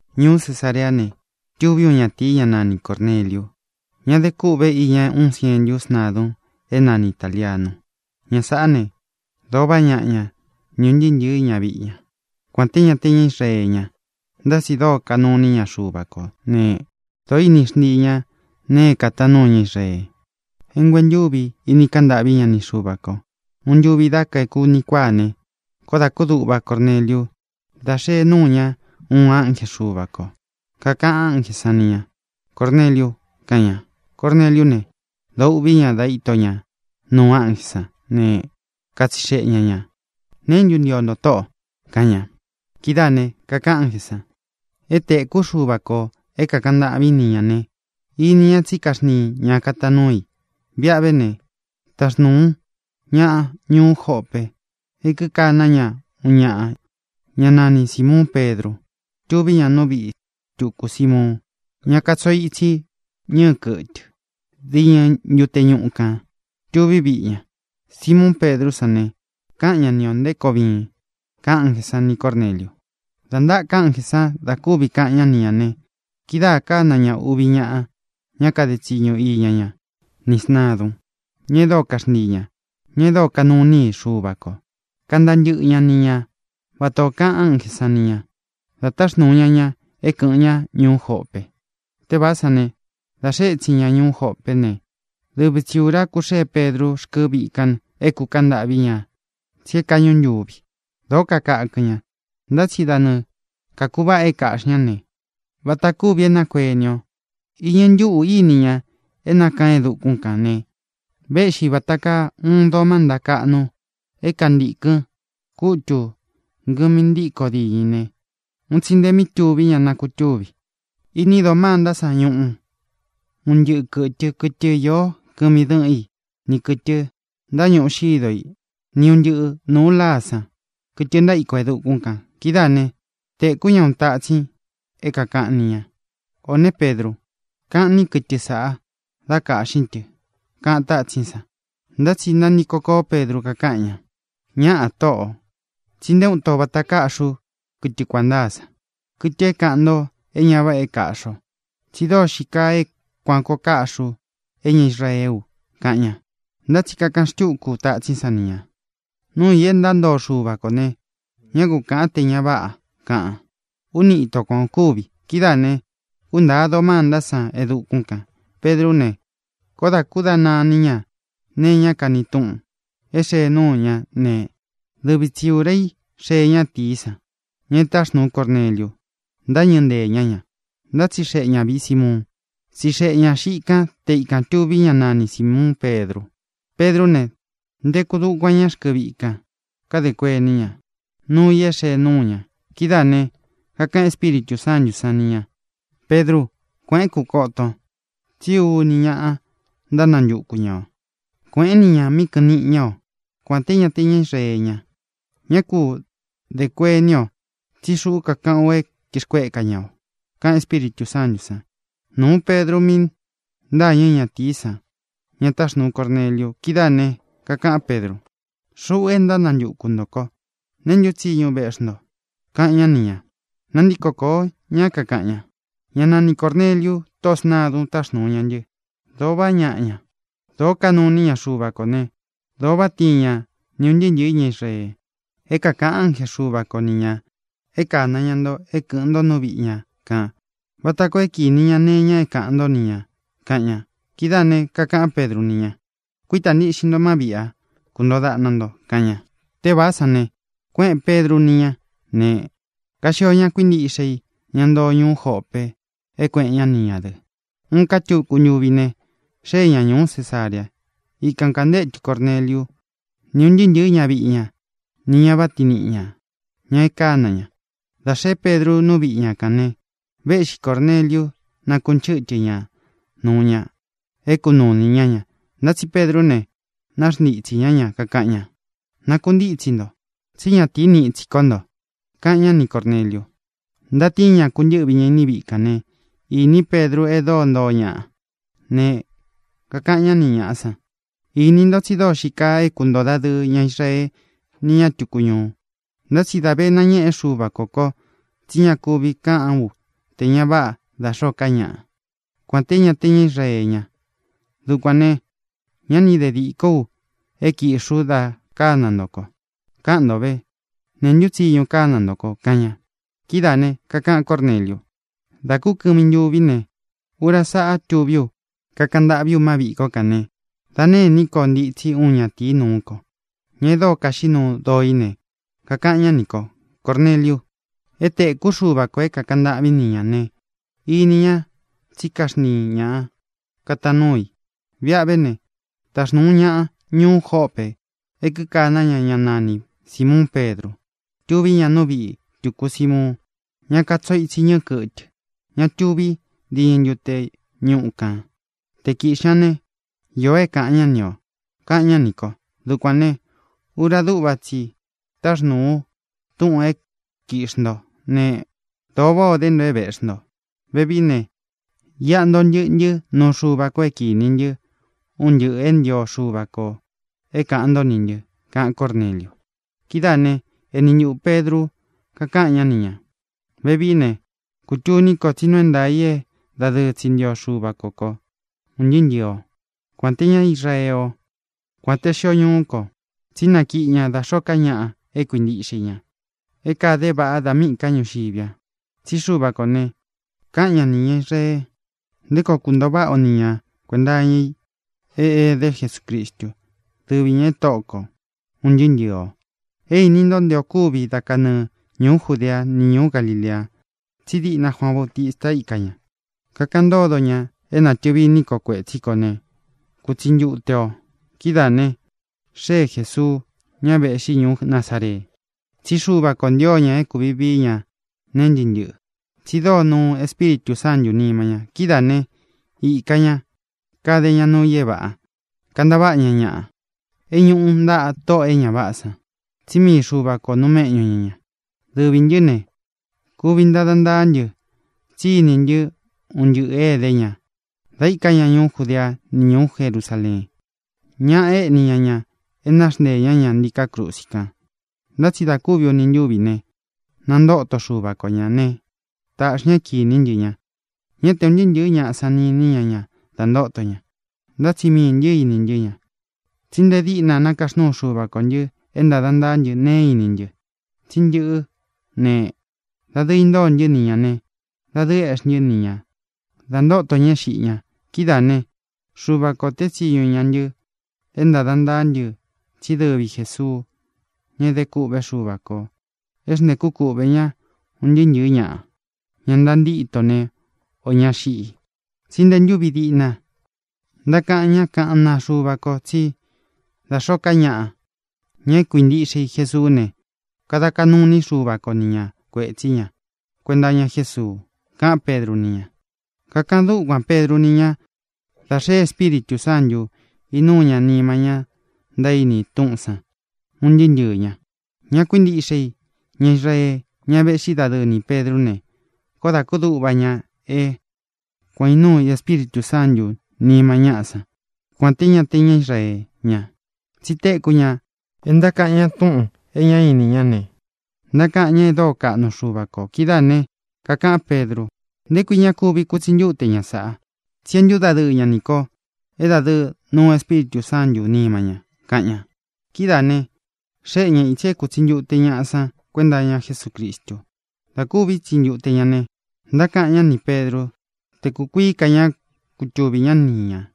Ñuú Cesareá ne, tūví uun ñatīi, ñá nani Cōrneliu, ñá de kúꞌve iña uun sientu sntadun é nani Itālianu. Ña sāꞌá ne, dōo vaꞌá ñaꞌa ña ni ūn ntɨɨ́ ntɨ̄ɨ́ ñaviꞌi ña. Kuān te ñá te ña Israee ña, ntá tsi dōo kanúu ini ña Xuva kō né, dōo íni xntii ña nee é kātaan núu ña Israee, é nguentúvi ini kaꞌan ntâꞌvi ña ni Xuva kō. Uun ntuvi dá kaeku uni kuáa ne, koó dā kúduꞌva Corneliu dá xēe núu ña uun ánje Xuva kō. Kakaꞌan ánjē sán ni ñā: —¡Córneliu! —kaꞌan ña. Corneliú ne, dōo uꞌví ña da íto ña nuu ánjē sán ne, katsixeꞌe ña ñā: —¿Neé ntu ntio nto, Tóꞌō? —kaꞌan ña. Kidáā ne, kakaꞌan ánjē san: —É tēkú Xuva kō é kākaꞌan ntâꞌvín ni ñā ne, ini ña tsí kaxntiin ña kataan núu i. Viꞌa ve ne, taxnūun ñaꞌa ñuú Jope é kikana ña uun ñaꞌa, ñá nani Sīmuun Pedru. Tuví ña nú viꞌi tuku Simuun, ña katsoo itsi ñɨɨ kɨtɨ. Diñɨ́ ntute ñuꞌu kān tuví viꞌi ña. Sīmuun Pedrú san ne, kaꞌan ñá ni ō nté koo viin —kaꞌan ánjē sán ni Cōrneliu. Dā ntáka ánjē san da kúvi kaꞌan ñá ni ñā ne, kidáā kána ña uvi ñaꞌa ña kade tsiñu iña ñá, ni sntādun, ña e dóo kaxntii ña, ña e dóo kanuu iní i Xuva kō, kantaa ntɨ́ꞌɨ ña ni ña vata ō kaꞌan ánjē san ni ña, dā táxnūu ña ña é kɨ̄ꞌɨn ñá ñuú Jope. Tévāá san ne, dā xee étsin ña ñuú Jópe ne, dɨvi tsi ūra kuxée Pedru rkɨ́ viꞌi kān é kūkaꞌan ntâꞌví ña, tsí é kāꞌñú ntuvi. Dōó kakakɨn ña, ntá tsi da nɨɨ kākuváꞌa é kāꞌxi ñá ne, vata kuvi é nakueni o, iñɨ ntúꞌū íni ña é nákaan e dukún kān ne, véꞌxi vāta kaa uun doo mánta kaꞌnu é kantīkɨn kútū ngɨmi ntíkō diñɨ i ne, un tsi nte mi túvi ña nakutúvi. Ini doo mánta sán ñuꞌu un ntɨꞌɨ kɨtɨ, kɨtɨ īó kɨmi dɨ́ꞌɨn i, ni kɨ̄tɨ ntáñuꞌu xído i, ni un ntɨꞌɨ nūu láa san, kɨtɨ ntaíko e dukún kān. Kidáā né, tēkú ña uun tátsín i é kākaꞌan ni ña: —O ne, Pedru, kaꞌnín kɨtɨ sāꞌa, dá kāꞌxín tɨ —kaꞌan tátsín san. Ntá tsi nantiko kóo Pedru, kakaꞌan ña: —¡Ñáꞌā, Tóꞌō! tsí nté uun ito vata kaꞌxí u kɨtɨ kuān ntáa san, kɨtɨ é kaꞌan nto é ña váꞌa é kaꞌxi o. Tsí dóo xii kaa é kuān koo kaꞌxí u é ña Israeé u —kaꞌan ña. Ntá tsi kakaꞌan xtúku tatsín san ni ñā: —Nuu i é ntantoo Xúva kō ne, ñá ku kāꞌan té ña váꞌa —kaꞌan. Úni īto kuan o kúvi. Kidáā ne, kúntāa doo mántá san e dukún kān. Pedrú ne, koó dā kúdana iní ña nee iñá kani túꞌun é xēe núu ña ne, dɨvi tsi ūra í xee ñátīí san, ña e táxnūu Corneliu, ntáñɨ̄ ntée ña ña, ntátsixeꞌe ña vīꞌi Simuun. Tsixeꞌe ña xiꞌi kan te ikān tuví ña nani Sīmuun Pedru. Pedrú ne, nteku dukuan ñá rkɨ viꞌi kan, kadē kuení ña nuu i é xēe núu ña. Kidáā ne, kakaꞌan Espíritū Sántū sán ni ñā: —Pedrú, kuēꞌén, kūkoton, tsí uni ñaꞌa ntánantuku ña ō. Kuēꞌén ni ñā míꞌi kɨꞌɨn niꞌi ña o. Kuān te ñá te ña Israee ña, ñá ku dē kueni o, tsí xuꞌú kakaꞌán u é kīxkueka ña o —kaꞌan Espíritū Sántū san. Nūu Pedru mí ntâñɨ ñátīí san, ña táxnūu Corneliu. Kidáā ne, kakaꞌán Pedru: —Xuꞌu é ntánantuku ntō ko. ¿Neē ntú tsiñu véꞌxi nto? —kaꞌan ñá ni ñā. Nantíko koō ñá, kakaꞌan ña: —Ña nani Cōrneliu, tóꞌō sntadun, táxnūu ña ntɨ. Dōo vaꞌá ñaꞌa ña, dōo kanuu iní ña Xuva kō ne, dōo váꞌa tiin ñá ni ūn ntɨɨ́ ntɨ̄ɨ́ ña Israee. É kākaꞌan ánje Xuva ko ni ñā é kāna ña nto é kɨ̄ꞌɨn nto nú viꞌi ña kān vata koo é kinī ña nee iña é kāꞌan ntó ni ñā —kaꞌan ña. Kidáā ne, kakaꞌán Pedru ni ña: —Kuítā ntiꞌxin nto má viꞌi a, kuntōo daꞌna nto —kaꞌan ña. Tévāá san ne, kuéꞌēn Pedru ni ñá ne, kaxio ña kuíntiꞌxe i, ña ntoo ñuú Jope, é kuēꞌen ñá ni ñā dɨ. Uun ká tuku ntuvi ne, xée ña ñūú Cesarea. Ikan kāntétu Corneliu ni ūn ntɨɨ́ ntɨ̄ɨ́ ñaviꞌi ña nī ña váꞌa tiin niꞌi ñā, ña e kána ña. Dā xeé Pedru nú viꞌi ña kān ne, véꞌxi Cōrneliu, nákunchɨtɨ ña nūu ña é kunuu ini ñá ña. Ntá tsi Pedrú ne, naxntitsī ñá ña, kakaꞌan ña: —Nakuntítsi nto, tsí ñatīí niꞌi tsi ko ntō —kaꞌan ñá ni Cōrneliu. Ntatíin ña, kūntɨ́ꞌvi ña iní viꞌi kān né, īní Pedru e dóo ntoo ñaꞌa. Ne, kakaꞌan ñá ni ñāꞌa san: —Ini nto tsi dóo xii kaa é kuntōo dadɨɨ ñá Israee ni ña tuku ñuu; ntá tsi dā vé nañēꞌe Xúva kō ko tsí ña kúvi kāꞌán u te ña váꞌa da xōó ka ñaꞌa, kuān té ña te ña Israee ña. Dukuān ne, ñá ni de dīkó u é kīꞌxi ú da kána nto ko. Káꞌan nto vē: ¿neé ntu tsiñu kána nto ko? —kaꞌan ña. Kidáā ne, kakaꞌan Córneliu: —Dā kú kɨmi ntuví ne, ura sáꞌa tuví u, kakaꞌan ntâꞌví u má viꞌī kó a ne, dā nêní ko ntitsi uun ñatīí nuú ko, ña e dóo kaxiꞌí nuu doo í ne, kakaꞌan ñá nī ko: “Córneliu, é tēkú Xuva kō é kākaꞌan ntâꞌvín ni ñā ne, ini ña tsí kaxntiin ña kataan núu i. Viꞌa ve ne, taxnūun ñaꞌa ñuú Jope é kíkaná ña ña nani Sīmuun Pedru. Tuví ña nú viꞌī tuku Simuun, ñá katsoo itsi ñɨɨ kɨtɨ, ña tuví diñɨ ntute ñuꞌu kān. Te kīꞌxi ña ne, īo é káꞌān ñá ni ō”, kaꞌan ñá nī ko. Dukuān ne, ura dúꞌva tsi i táxnūu ú túꞌūn é kiꞌxī ntó ne, dōo váꞌā o dé nto é vēꞌxí nto. Vevií ne, iꞌa ntoo ntɨꞌɨ ntɨ́ nuú Xuva kō é kīni ntɨ́ un ntɨꞌɨ̄ e ntío Xuva kō é kāꞌan ntó nī ntɨ —kaꞌan Córneliu. Kidáā né, eni ntuꞌū Pedru, kakáꞌan ñá ni ñā: —Vevií ne, kutuní ko tsí nuu é ntaā i é dadɨɨ tsi ntío Xuva ko kō, un ntɨɨ́ ntɨɨ̄ ó, kuān te ñá Israee o, kuān te xio ñuú kō, tsí nakiꞌi ña da xóo ka ñaꞌa e kuíntiꞌxe i ña, e kade é vāꞌá, da míꞌī ká ñuu ñuxiví a. Tsí Xuva kō ne, káꞌan ña nī ña Israee nté koo kuntoo váꞌa o ni ña kuēnta iña i é edé Jesucristu, dɨvi ñā é Tóꞌo ko, ūn ntɨɨ́ ntɨɨ̄ o. É īni nto nte o kúvi dá kanɨɨ ñūú Judea ni ñuú Galilea. Tsí diꞌna Juaan Bautista íka ña, kakaꞌan ntódo ña é nātɨvi iní ko kuētsí kō ne, kutsi ntute ō. Kidáā ne, xée Jesuu, ña véꞌxi ñuú Nazaree. Tsí Xuva kō ntío ña é kūvi vií ña nee ntɨ́ꞌɨ ntɨꞌɨ, tsi dóo nuu Espíritū Sántū nima ña. Kidáā né, īka ña, kade ña nuu i é vāꞌá, kantaváꞌa ña ñaꞌa é ñuꞌu ntaꞌa tóꞌō é ña váꞌā san. Tsí mii Xuva kō nuu méꞌñu ña ña. Dɨvī ntɨ́ ne, kuvi ntada ntaá ntɨ tsí īní ntɨ un ntɨꞌɨ̄ é edé ña da íka ña ñuú Judea ni ñuú Jerusaleen. Ñaꞌa éꞌni ña ña, é naxnteē ñá ña ntíkā krusi kan. Ntá tsi da kúvi uni ntúvi ne, nantóto Xuva ko ñā ne, táꞌxi ña é kīní ntɨ ña. Ñá te un ntɨɨ́ ntɨ̄ɨ́ ñaꞌa san ni īni ña ña da ntoto ña, ntá tsi miī ntɨ́ ini ntɨ́ ña. Tsí nte díꞌna nákaxnuu Xuva kō ntɨ́ é ntāda ntaá ntɨ nee é īni ntɨ. Tsí ntɨꞌɨ́ ne, dadɨɨ intóo ntɨ́ ni ñā ne, dadɨɨ éꞌxi ntɨ́ ni ña da ntóto ña é xiꞌi ña. Kidáā né, Xuva kō tée tsiñu ña ntɨ é ntāda ntaá ntɨ tsí dɨvi Jēsuú, ña e dé kûꞌvé Xuva kō é xntēkú kuꞌvē ñá un ntɨɨ́ ntɨ̄ɨ́ ñaꞌa, ña ntántito ne, ō ña xiꞌi. Tsí nte ntúvi diꞌna ntákaꞌan ñá kaꞌán naa Xuva ko tsí da xōó ka ñaꞌa, ña é kuīntiꞌxe i Jesuú ne, kada kaꞌnu iní Xuva ko ni ña kuētsí ña kuenta iña Jésuu —kaꞌán Pedru ni ña. Kakaꞌan dúkuān Pedru ni ña da xee Espíritū Sántū, inúu ña nima ña ntaíni túꞌūn san, un ntɨɨ́ ntɨɨ̄ ña. Ña kuíntiꞌxe i, ña Israee, ñá véꞌxi dadɨɨ ni Pēdrú ne, koó dā kúduꞌva ña é kuān ó inúu Espíritū Sántū nima ñáꞌa san, kuān te ñá te ña Israee ña. Tsi téku ña é ntákaꞌan ña túꞌūn e ñá ini ñá ne, ntákaꞌan ña e dóo kaꞌnu Xuva kō. Kidáā ne, kakaꞌán Pedru: —¿Nté kui ña kuvi kutsi ntúte ña sāꞌa? Tsí é ntūdadɨɨ ña ni ko é dadɨɨ nuu Espíritū Sántū nima ña —kaꞌan ña. Kidáā ne, xéꞌe ña ītsi é kūtsi ntute ñaꞌa san kuenta iña Jesúcristu. Dā kúvi itsi ntute ña ne, ntákaꞌan ñá ni Pēdrú te kūkuií ka ñá kutuvī ñá ni ñā.